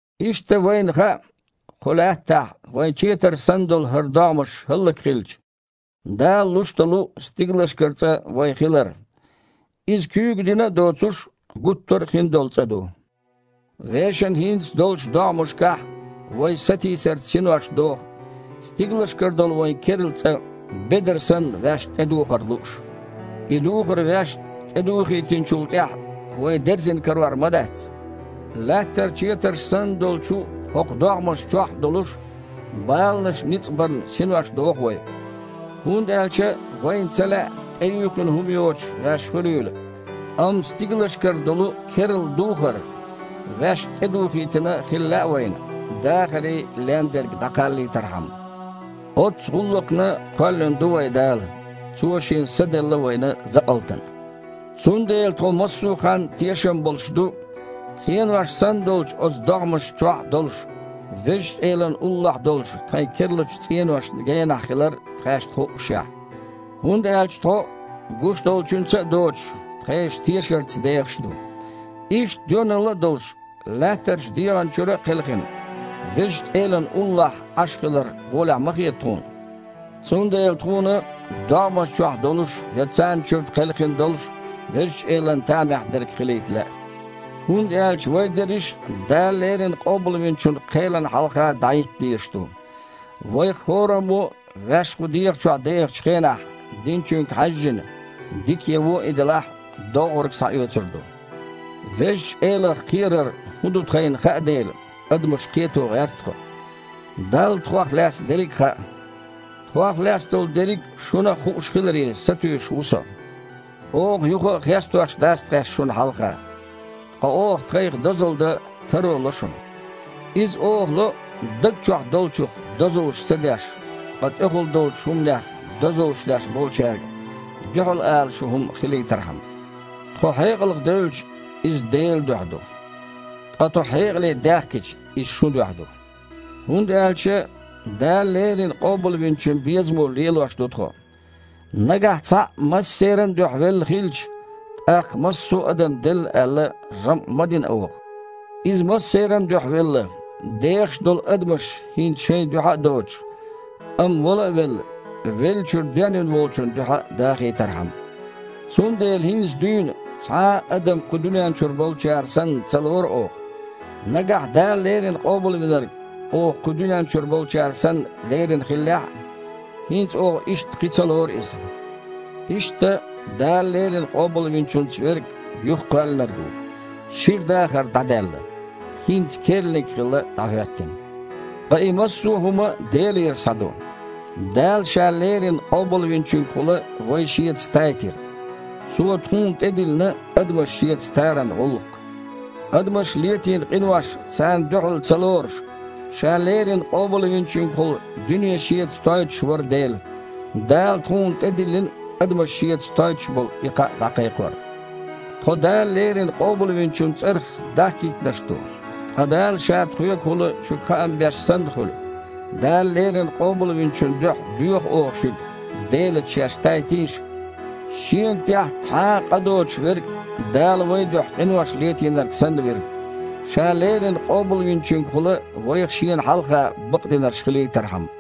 Иштта, вайна хаьа, кху лаьттахь вайн четар санна долу хІара догІмаш хІаллакьхилча, Дала луш долу стигалшкара цІа вайн хилар. Иза куьйга дина а доцуш, гуттара а хин долу цІа ду. Вешан хІинца долчу догІмашкахь вай сатийсарца синош доху, стигалшкара долу вайн керла цІа, бедар санна, ваьшна тІедухар лууш. И духар ваьшна тІедухийтинчул тІаьхьа, вай дерзина карор ма дац! Лаьттара четарш санна долчу хІокху догІмашна чохь а долуш, баланаша ницкъ барна синош доху вай. ХІунда аьлча вайна ца лаьа тІеюьйхина хІума йоцуш ваьш хуьлийла, амма стигалшкара долу керла духар ваьшна тІедухийтина хила лаьа вайна, дахаре лен дерг дІакхаллийтархьама. Оццу гІуллакхна кхоьллина ду вай Дала. Цо Шен Са делла вайна закъалтана. Цундела тхо массо а ханна тешам болуш ду, цІенош санна долчу оцу догІмашна чохь а долуш, Везачу Элана уллохь долчу тхайн керлачу цІеношна генахь хилар тхаьшна хуъушехь. ХІунда аьлча тхо, гуш долчуьнца а доцуш, тхешан тешарца дехаш ду. Иштта, доьналла а долуш, лаьттарчу дегІана чуьра а кхелхина, Везачу Элана уллохь Іаш хилар гІолехь ма хета тхуна. Цундела тхуна, догІмашна чохь долуш я царна чуьра кхелхина долуш, Везачу Элана тамехь дерг хилийта лаьа. ХІунда аьлча вай дерриш а Дала леррина Къобалвинчун кхелана хьалха дІахІитта дезаш ду. Вайх хІораммо а ваьш кху дегІа чохь дехачу хенахь динчуьнга хьаьжжина, дика я вон и делахь, доггІург схьаоьцур ду. Везачу Элах кхерар хІун ду тхайна хаьа дела, адамаш кхето гІерта тхо. Далла тхох лаьцна дерриг а хаьа. Тхох лаьцна долу дерриг а шуна а хууш хиларе сатуьйсуш ву со. Оха юха а хестош дац тхаьш шуна хьалха. Ткъа оха тхайх дозалла дан таро ло шуна. Иза оха ло, даг чохь долчух дозаллаш ца деш, ткъа тІехула долчу хІуманех дозаллаш деш болчаьрга дуьхьал ала шун хІума хилийтархьама. Тхо хьекъалх девлча, иза Делан дуьхьа ду. Ткъа тхо хьекъале даьхкича, иза шун дуьхьа ду. ХІунда аьлча Дала леррина Къобалвинчун безамо лелош ду тхо. Нагахь Цхьаъ массеран а дуьхьа велла хилча, тІаккха, массо а адам делла аьлла, жамІ ма дина оха. Иза массеран а дуьхьа велла, дехаш долу адамаш хІинца шайн дуьхьа а доцуш, амма, вала а велла, веллачуьра денвина волчун дуьхьа дахийтархьама. Цундела хІинца дуьйна цхьа а адам кху дуьнен чуьра болчара санна ца лору оха. Нагахь Дала леррина Къобалвинарг оха кху дуьнен чуьра болчара санна лерина хиллехь а, хІинца оха иштта кхин ца лору Иза. Иштта, Дала леррина Къобалвинчуьнца верг – юхакхоьллинарг ву. Шира дахар дІадаьлла, хІинца керланиг хилла дІахІоьттина! Ткъа и массо а хІума Делера схьа ду. Дала Ша леррина Къобалвинчуьнгахула вай Шеца тайтира. Цо тхуна тІе диллина адамаш Шеца таран гІуллакх. Адамаша летийна къинош царна дуьхьал ца лоруш, Ша леррина Къобалвинчуьнгахула дуьне Шеца тойтуш вара Дела. Дала тхуна тІедиллина адамаш Шеца тойтуш болу и кхаъ дІакхайкхор. Тхо Дала леррина Къобалвинчун цІарах дахкийтинарш ду, ткъа Дала Ша тхоьгахула шуьга хаам беш санна хуьлу. Дала леррина Къобалвинчун дуьхьа доьху оха шуьга: «Делаца шаьш тайтийша!» Шена тІехь цхьа а къа доцуш Верг Дала вайн дуьхьа къинош летийнарг санна вира, Ша леррина Къобалвинчуьнгахула вайх Шена хьалха бакъдинарш хилийтархьама.